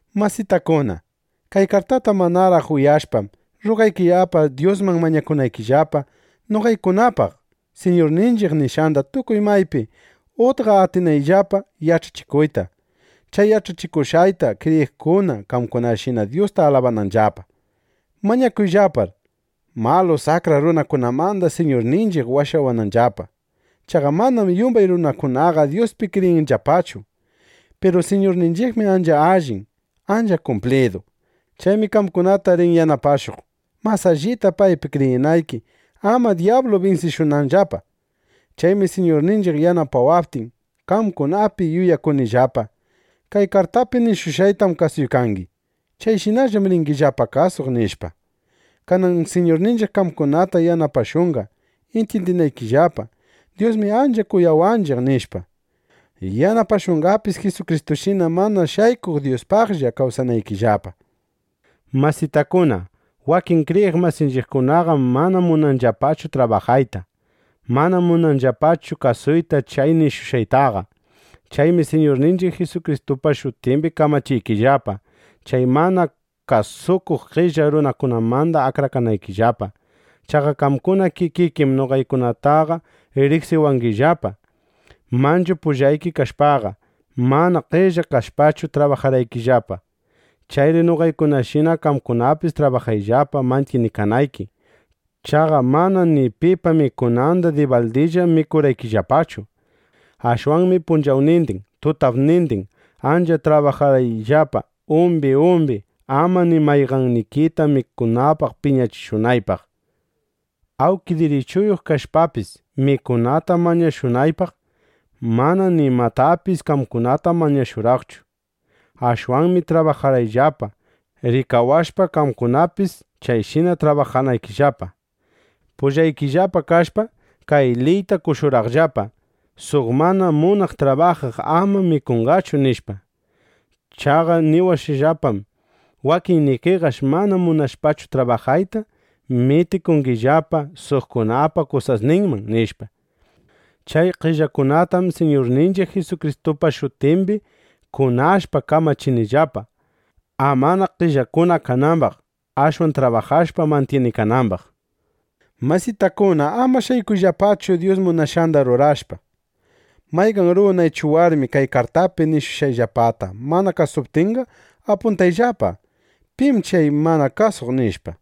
Masitakuna, kay kartata manaraq ushyashpam, rrugaykillapa Dyusman mañakunaykillapa, noqaykunapaq, Siñurninchiq nishqanda tukuy maypi utqa atinayllapa yach'achikuyta, chay yach'achikushqayta kriyiqkuna qamkunashina Dyusta alabananllapa. Mañakuyllapar, malu, saqra runakunamanda Siñurninchiq washawananllapa. Chaqa manam yumbay runakunaqa Dyuspi kriyinllapachu. Piru Siñurninchiqmi ancha allin, ancha kumplidu. Chaymi qamkunata rin yanapashuq, mas allita paypi kriyinayki, ama dyablu binsishunanllapa. Chaymi Siñurninchiq yanapawaptin, qamkunapi yuyakunillapa: Kay kartaypi nishushqaytam kasuykangi. Chayshinallam ringillapa kasuq, nishpa. Kanan Siñurninchiq qamkunata yanapashunqa intyindinaykillapa: Dyusmi ancha kuyawanchiq, nishpa. Yanapashunqapis Jisukristushina mana shaykuq Dyuspaqlla kawsanaykillapa. Masitakuna, wakin kriyiq masinchiqkunaqam mana munanllapachu trabajayta. Manam munanllapachu kasuyta chay nishushqaytaqa. Chaymi Siñurninchiq Jisukristupa shutimbi kamachiykillapa, chay mana kasukuq qella runakunamanda akrakanaykillapa. Chaqa qamkuna kikikim noqaykunataqa riqsiwangillapa. Manchu pullayki kashpaqa, mana qella kashpachu trabajarqayllapa. Chayri noqaykunashina qamkunapis trabajayllapa mantyinikanayki. Chaqa manam ni pipa mikunanda dibaldillaqa mikurqayllapachu. Ashwanmi punchawnindin, tutapnindin ancha trabajarqayllapa umbi umbi, ama ni mayqannikita mikunapaq piñachishunaypaq. Awnki dirichuyuq kashpapis mikunata mañashunaypaq, mana nimatapis qamkunata mañashurqaychu. Ashwanmi trabajarqayllapa, rikawashpa, qamkunapis chayshina trabajanaykillapa. Pullaykillapa kashpam, kay liyta qoshurqaqllapa: “Suq mana munaq trabajaq ama mikunqachu”, nishpa. Chaqa niwashqallapam: Wakinnikiqash mana munashpachu trabajayta, mitikungillapa suqkunapa kusasninman, nishpa. Chay qellakunatam Siñurninchiq Jisukristupa shutimbi kunashpa kamachinillapa, amana qellakuna kanambaq; ashwan trabajashpa mantyinikanambaq. Masitakuna, ama shaykuyllapachu Dyus munashqanda rurashpa. Mayqan runa ichu warmi kay kartaypi nishushqayllapata mana kasuptinqa, apuntayllapa: Pim chay mana kasukuq, nishpa.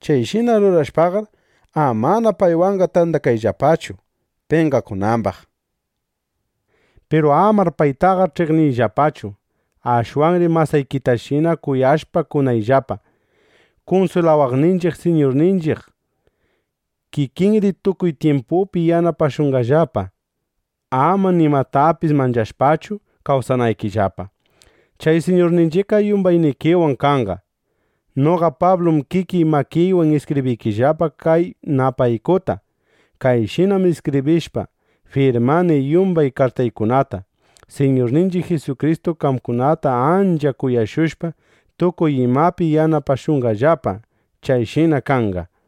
Chayshina rurashpaqar, amana paywanqa tandakayllapachu, penqakunambaq. Piru amar paytaqa ch'iqniyllapachu. Ashwanri masaykitashina kuyashpa kunayllapa. Kunswilawaqninchiq Siñurninchiq kikinri tukuy tyimpupi yanapashunqallapa, ama nimatapis manchashpachu kawsanaykillapa. Chay Siñurninchiqqa yumbaynikiwan kanqa. Noqa Pablum kikiy makiywan iskibriykillapa kay napaykuta. Kayshinam iskibrishpa, firmani yumbay kartaykunata. Siñurninchiq Jisukristu qamkunata ancha kuyashushpa tukuy imapi yanapashunqallapa. Chayshina kanqa.